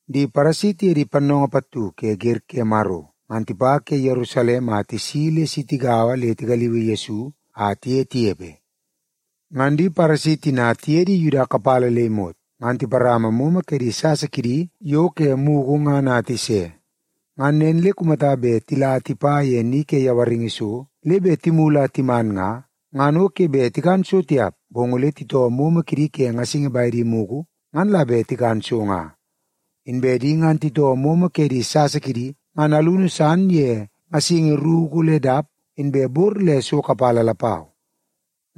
Di Paresi tiye di pannoongoo pattu ke wer ke Maro ngan tipa ke Yerusalem a tisi le si tigaua le tigaliui Yesu a tiye tinepe. Ngan di Paresi tina tiye di Yuda kapala le imot, ngan tiparama momo ke di sasa kidi yo ke mugu ngan a tise. Ngan nen le kumata bet tila tipa ye ni ke yawaringi so le bet timulu a timan nga, ngan o ke bet tikan so tiap, bong ole titoo momo kidi ke ngasingi bedi mugu, ngan la bet tikan so nga. Inbe di ngan titoo momo ke di sasa kidi ngan alunu san ye ngasingi ruku le dap inbe bor le so kapala lapau.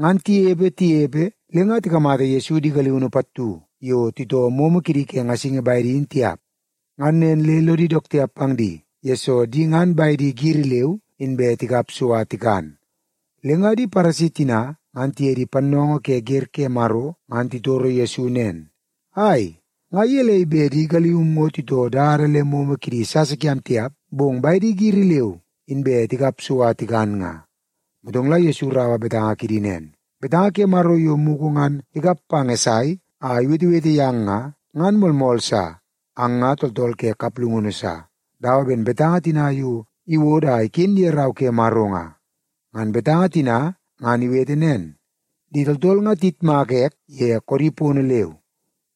Ngan tinepe, tinepe, le nga tikamata Yesu di galiunu pattu yo titoo momo kidi ke ngasingi bedi in tiap. Ngan nen le lodi dook tiap pang di, yesoo di ngan bedi giri leu inbe tikap so a tikan. Le nga di Paresi tina ngan tiye di pannoongoo ke wer ke Maro ngan titoro Yesu nen, “Ai, nga gelei bet di galium ngo titoo dada le momo kidi sasa kiam tiap, bong bedi giri leu inbe tikap so a tikan nga?” Motong la Yesu iraua betanga kidi nen, “Betanga ke Maro yo mugu ngan ikap pang Esai a iwetewete yang nga, ngan moolmool sa. Ang nga tooltool ke kaplungunu sa, dawa ben betanga tina yo iwodo a iken ye Rau ke Maro nga. Ngan betanga tina ngan iwete nen, ‘Di tooltool nga tiyitmaka ek ye koodi pono leu,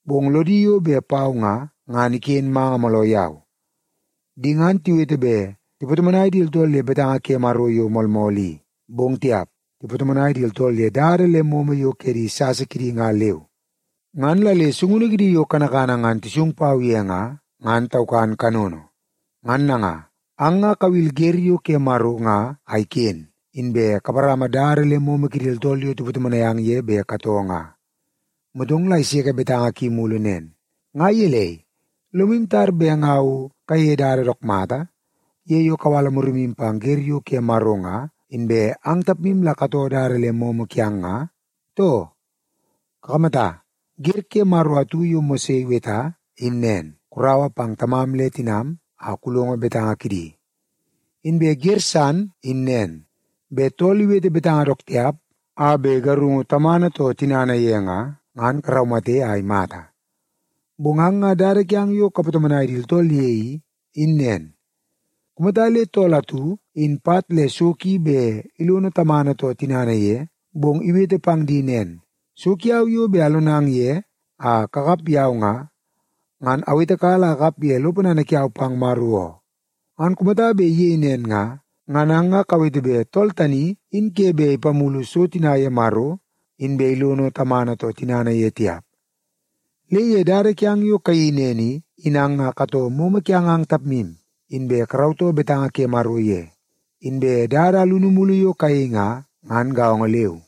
bong lodi yo bet pau nga, ngan iken manga mooloo yau. Di ngan tiwete bet tipatomonai di tooltool ye betanga ke Maro yo moolmool i, bong tiap, tipatomonai di tooltool ye dada le momo yo ke di sasa kidi nga leu. Ngan la le sungunu kidi yo kanakana ngan tisung pau ye nga, ngan taukan kanono.’ Ngan nanga, ang nga kawil wer yo ke Maro nga a iken, inbe kaparama dada le momo kidi tooltool yo tipatomonai ang ye bet katoo nga.” Motong la iseke betanga ki mulu nen, “Nga gelei, lomu tar bet nga o kayeie dada dook mata ye yo kawala murimu pang wer yo ke Maro nga, inbe ang tapmu la katoo dada le momo yo kiang nga, too? Kakamata, wer ke Maro atu yo Mose iweta in nen, ‘Kuraua pang tamam le tinam a kulongo betanga kidi.’ Inbe wer san in nen, ‘Bet tool iwete betanga dook tiap a bet igarungu tamana too tinana ye nga, ngan karaumate a imata.’ Bong ang nga dada kiang yo kapatomonai di tooltool ye i, in nen. Kumata le tool atu, in pat le so ki bet ilono tamana too tinana ye, bong iwete pang di nen, ‘So kiau yo bet alonang ye a kakap yau nga, ngan awetekala a akap ye lo ponana kiau pang Maro oo,’ ngan kumata bet iyei nen nga, ngan ang nga kawete bet tool tani in ke bet ipamulu so tina ye Maro inbe ilono tamana too tinana ye tiap. Le ye dada kiang yo kayeii nen i, in ang nga katoo momo kiang ang tapmu, inbe karautoo betanga ke Maro ye. Inbe dada alunu mulu yo kayei nga, ngan gaongo leu.”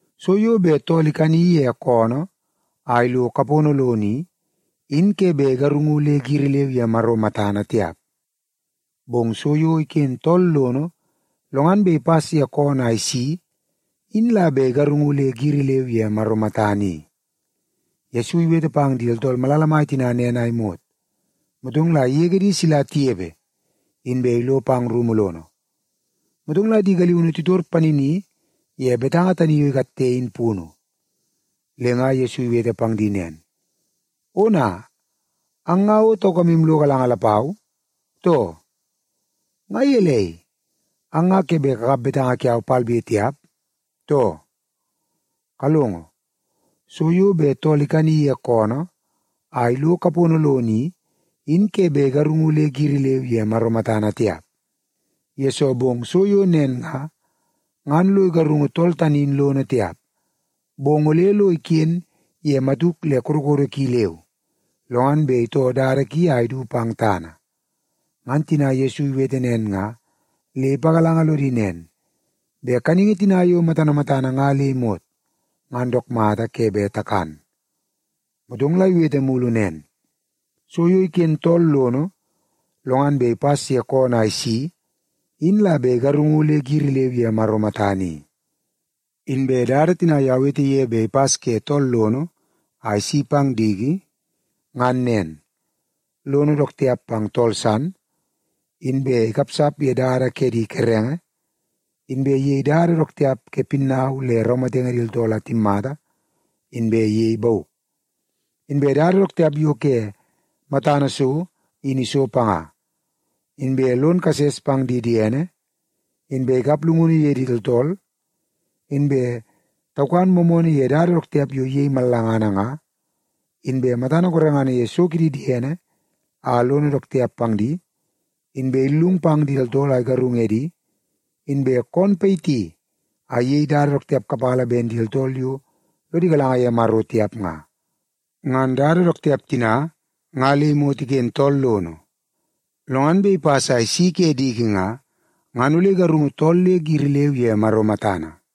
So yo bet tool ikani ye koonoo a ilo kapono lono i, in ke bet igarungu le giri leu ye Maro matana tiap. Bong so yo iken tool lono, lo ngan bet ipas ye koonoo a isi in la bet igarungu le giri leu ye Maro matana i.” Yesu iwete pang di tooltool malala mai tina nen a imot, motong la igege di sila tinepe, inbe ilo pang rumu lono. Motong la di galiunu titor panini ye betanga tani yo ikatte, in punu. Le nga Yesu iwete pang di nen, “Ona, ang nga o taukamu lo galanga lapau, too? Nga gelei, ang nga ke bet kakap betanga kiau palbe tiap, too? Kalongo, so yo bet tool ikani ye koonoo a ilo kapono lono i, in ke bet igarungu le giri leu ye Maro matana tiap, yesoo bong so yo nen nga, ngan lo igarungu tool tani in lono tiap. Bong ole lo iken ye matuk le kodokodo ki leu, lo ngan bet itoo dada ki a idu pang tana.” Ngan tina Yesu iwete nen nga le ipagalanga lodi nen, bet kaningi tina yo matana matana nga le imot, ngan dook mata ke bet takan. Motong la iwete mulu nen, “So yo iken tool lono, lo ngan bet ipas ye koonoo a isi in la bet igarungu le giri leu ye Maro matana i. Inbe dada tina yo awete ye bet ipas ke tool lono a isi pang diki, ngan nen; lono dook tiap pang tool san, inbe ikapsap ye dada ke di kerenge, inbe iyei dada dook tiap ke pinnau le raumatenge di tooltool a timmata, inbe iyei bauk. Inbe dada dook tiap yo ke matana so in iso panga, inbe lon kases pang di diene, inbe ikap llungunu ye di tooltool, inbe taukan moomoonoo ye dada dook tiap yo iyei mallangana nga, inbe matana gorengana ye so kidi diene a lono dook tiap pang di, inbe illung pang di tooltool a igarung edi, inbe koon payiti a iyei dada dook tiap kapala ben di tooltool yo lodi galanga ye Maro tiap nga. Ngan dada dook tiap tina nga le imot iken tool lono, lo ngan bet ipas a isi ke diki nga, ngan ole igarungu tool le giri leu ye Maro matana.”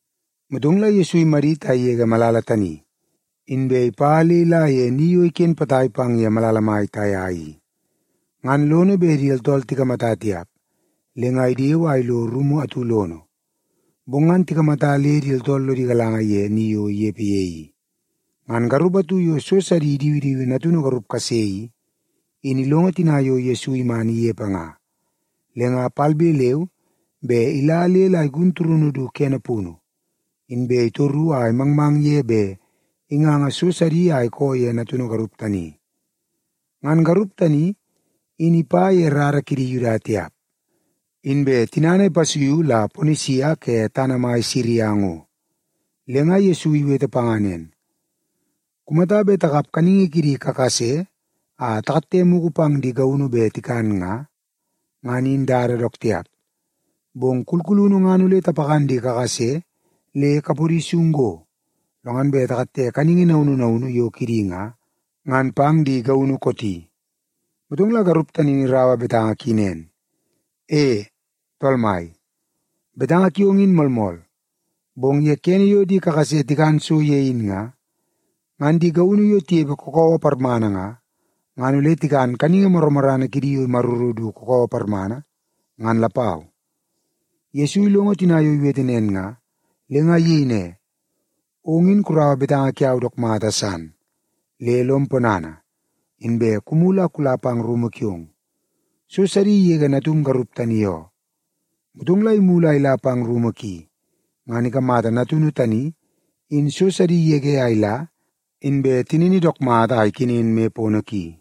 Motong la Yesu imadit a igege malala tani, inbe ipa le ila ye ni yo iken potai pang ye malala mai Taia i. Ngan lono bet di tooltool tikamata tiap, le nga idewe a ilo rumu atu lono. Bong ngan tikamata le di tooltool lodi galanga ye ni yo inepe ye i. Ngan garup atu yo so sidi idiwidiwi natunu garup kase i, in ilongo tina yo Yesu iman inepe nga, le nga palbe leu be ila le la igun turunu du kene punu, inbe itoru a imangmang ye bet inganga so sidi a ikoo ye natunu garup tani. Ngan garup tani in ipa ye rara kidi Yuda tiap, inbe tinana ipasuiu la Ponisia ke tana mai Siria ngo. Le nga Yesu iwete panga nen, “Kumata bet takap kaningi kidi kakase a takatte mugu pang di gaunu bet tikan nga, ngan in dada dook tiap. Bong kulkulunu ngan ole tapakan di kakase le kapodi sung go, lo ngan bet takatte kaningi naunu naunu yo kidi nga, ngan pang di gaunu kooti.” Motong la garup tani in iraua betanga ki nen, “E, Tool Mai, betanga kiong in moolmool. Bong ye kene yo di kakase tikan so ye in nga, ngan di gaunu yo tinepe kakawa parmana nga, ngan ole tikan kaningi morrana kidi yo imaruru du kakawa parmana, ngan lapau.” Yesu ilongo tina yo iwete nen nga, le nga iyei ne, “Ong in kuraua betanga kiau dook mata san, le lom ponana, inbe kumulu a kula pang rumu kiong. So sidi igege natum garup tani oo.” Motong la imulu a ila pang rumu ki, ngan ikamata natunu tani in so sidi igege a ila inbe tinini dook mata a ikenen moi pono ki.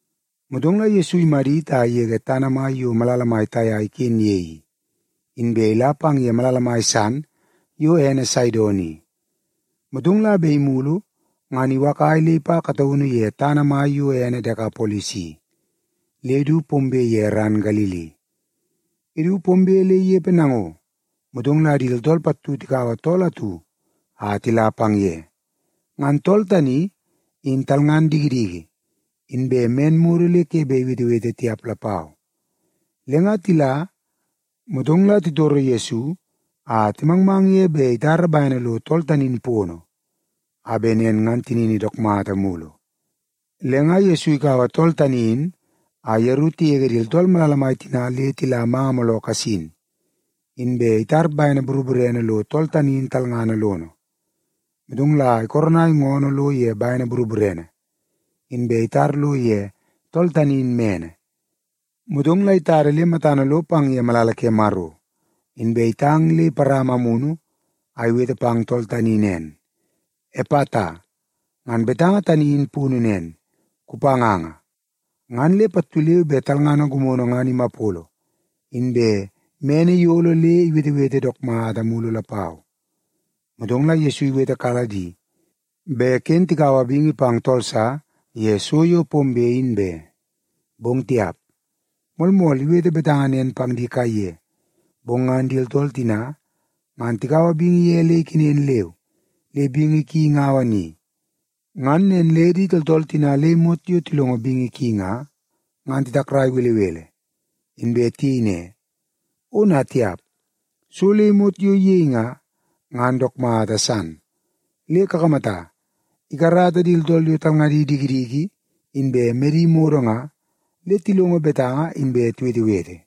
Motong la Yesu imadit a igege tana mai yo malala mai Taia iken ye i, inbe ila pang ye malala mai san yo ene Saidon i, motong la bet imulu ngan iwakai le ipa kataunu ye tana yo ene Dekapolis i, le du pombe ye ran Galili. Idu pombe le inepe nango, motong la di tooltool pattu tikaua tool atu a tila pang ye. Ngan tool tani in talngan dikidiki, inbe men modo le ke bet iwetewete tiap lapau. Le nga tila, motong la titoro Yesu a timangmang ye bet itara bene lo tool tani in pono, a bet nen ngan tinini dook mata mulu. Le nga Yesu ikaua tool tani in a yeru tigege di tooltool malala mai tina le tila manga mooloo kasin, inbe itar bene boroborene lo tool tani in talngana lono. Motong la ikoronai ngoonoo lo ye bene boroborene, inbe itar lo ye tool tani in mene. Motong la itada le matana lo pang ye malala ke Maro, inbe itang le iparama amunu a iwete pang tool tani nen, “Epata!” Ngan betanga tani in punu nen, “Kupanganga!” Ngan le pattu leu be talngana gimono ngan imapolo, inbe mene iyolo le iwetewete dook mata mulu lapau. Motong la Yesu iwetekala di bet ken tikaua bingi pang tool sa ye so yo pombe in be. Bong tiap! Moolmool iwete betanga nen pang di kaiye, bong ngan di tooltool tina ngan tikaua bingi ye le ikenen leu, le bingi ki ingaua ni. Ngan nen le di tooltool tina le imot yo tilongo bingi ki nga, ngan titakrai belebele. Inbe tiyei ne, “Ona tiap! So le imot yo iyei nga, ngan dook mata san. Le kakamata, ikarata di tooltool yo talngadi dikidiki inbe medi modo nga, le tilongo betanga inbe tiwetewete.”